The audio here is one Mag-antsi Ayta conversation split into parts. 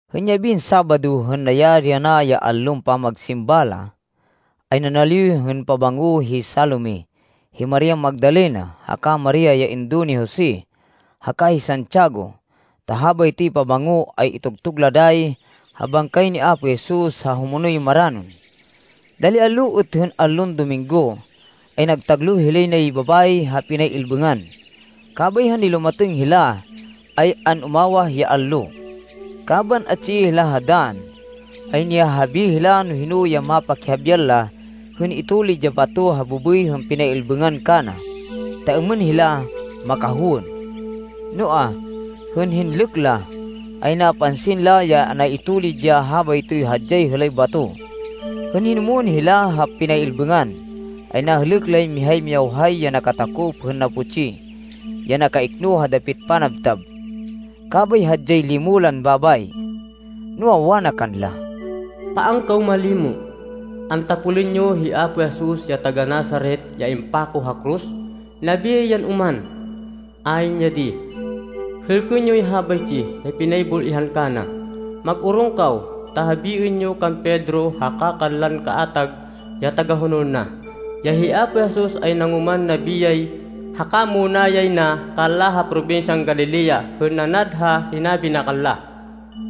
Hên yabin Sabado, hên nayari ya allon pamagsimba la, ay nanaliw hên pabango, hi Salome, hi Maria Magdalena, haka Maria ya indo ni Jose haka hi Santiago, ta habaytoy pabango, ay itugtug la dayi ha bangkay ni Apo Jesus ha humonoy maranon. Dali allo êt hên allon Dominggo, ay nagtagloh hilay nay babayi ha pinay-ilbêngan, kabay hên nilumatêng hila, ay an-umawah ya allo. Kaban atsi hila ha dann, ay nihahabi hila no hino ya mapakihabian la hên itulid ya bato ha bêbêy hên pinay-ilbêngan kana ta êmên hila makahowên. Noa, hên hinlêk la, ay napansin la ya naitulid ya habaytoy hadyay hêlay bato. Hên hinumwên hila ha pinay-ilbêngan, ay nahêlêk lay mihay miyawhay ya nakatakop hên naputsi ya nakaikno ha dapit panabtab, kabay hadyay limo lan babayi. Noa, wana kanla, “Paan kaw malimo! Antapolên yo hi Apo Jesus, ya taga-Nazaret ya impako ha koros. Nabiyay yan oman! Ayn ya di. Hêlkên yoy habaytsi ya pinaybul-ihan kana. Mag-orong kaw, ta habiên yo kan Pedro haka kanlan kaatag ya tagahonol na, ya hi Apo Jesus ay nangoman nabiyay, haka muna yay na kanla ha probinsyan Galilea hên nanad ha hinabi na kanla.”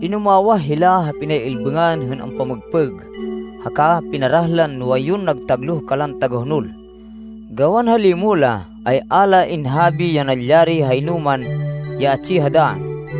Inumawah hila ha pinay-ilbêngan hên ampamêgpêg, haka pinarah lan nuwayun nagtagloh kanlan tagahonol. Gawan ha limo la, ay a la inhabi ya nalyari ha hinoman ya atsi ha dann.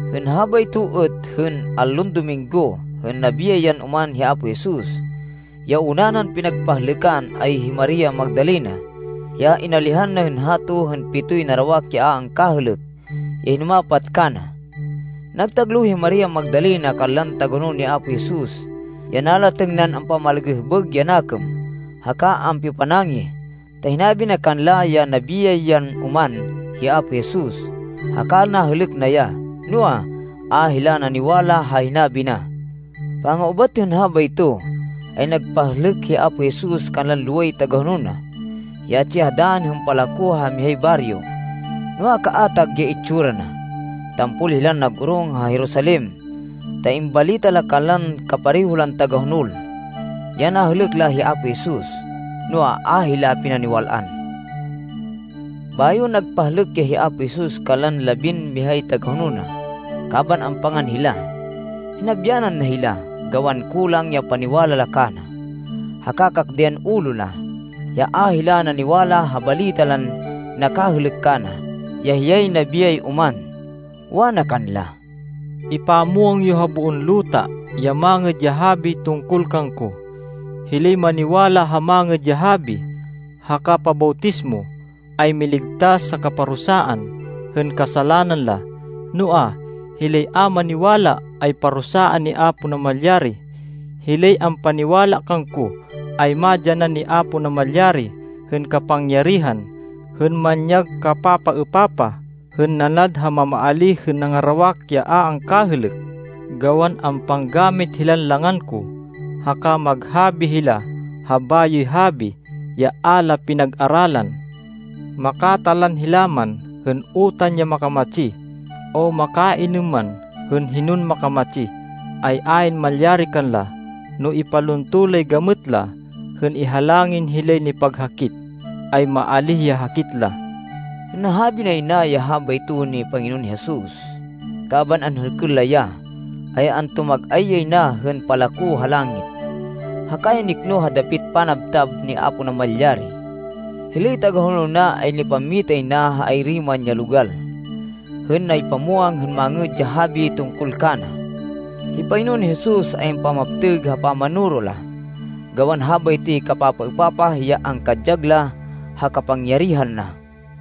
[Hên habayto êt hên allon Dominggo, hên nabiyay yan oman hi Apo Jesus, ya una nan pinagpahlêkan, ay hi Maria Magdalena, ya inalihan na hên hato hên pitoy narawak ya a angkahêlêk ya hinumapat kana. Nagtagloh hi Maria Magdalena kanlan tagahonol ni Apo Jesus ya nalatêng nan ampamalagêhbêg ya nakêm haka ampipanangih, ta hinabi na kanla ya nabiyay yan oman hi Apo Jesus haka nahêlêk na ya. Noa, a hila naniwala ha hinabi na. Panga-ubat hên habayto, ay nagpahlêk hi Apo Jesus kanlan loway tagahonol na, ya atsi ha dann hên palako ha mihay baryo, noa, kaatag ya itsura na. Tampol hilan nag-orong ha Jerusalem ta imbalita la kanlan kapareho lan tagahonol, ya nahêlêk la hi Apo Jesus, noa, a hila pinaniwal-an. Bayo nagpahlêk ya hi Apo Jesus kanlan labinmihay tagahonol na, kaban ampangan hila. Hinabyanan na hila, gawan kulang ya paniwala la kana, haka kakdêyan ulo la, ya a hila naniwala ha balita lan nakahêlêk kana ya hiyay nabiyay oman. Wana kanla, “Ipamwang yo ha boon luta ya Mangêd ya Habi tungkol kangko. Hilay maniwala ha Mangêd ya Habi, haka pabawtismo, ay miligtas ha kaparusaan hên kasalanan la. Noa, hilay a maniwala ay parusaan ni Apo Namalyari. Hilay ampaniwala kangko, ay madyanan ni Apo Namalyari hên kapangyarihan hên manyag kapapaêpapah, hên nanad ha mamaalíh hên nangarawak ya a angkahêlêk, gawan ampanggamit hilan langan ko, haka maghabi hila ha bayoy habi ya a la pinag-aralan. Makatalan hila man hên utan ya makamatsi, o makainêm man hên hinon makamatsi, ay ayn malyari kanla. No ipalunto lay gamêt la, hên ihalangin hilay nipaghakit, ay maalíh ya hakit la.” Hên nahabi nay na ya habayto ni Panginoon Jesus, kaban anhêlkên la ya, ay antumag-ay yay na hên palako ha langit, haka ya nikno ha dapit panabtab ni Apo Namalyari. Hilay tagahonol na ay nipammitay na ha ayri man ya logal, hên naypamwang hên Mangêd ya Habi tungkol kana. Hi Panginoon Jesus ay ampamaptêg ha pamanoro la, gawan habaytoy kapapaêpapah ya angkadyag la ha kapangyarihan na.]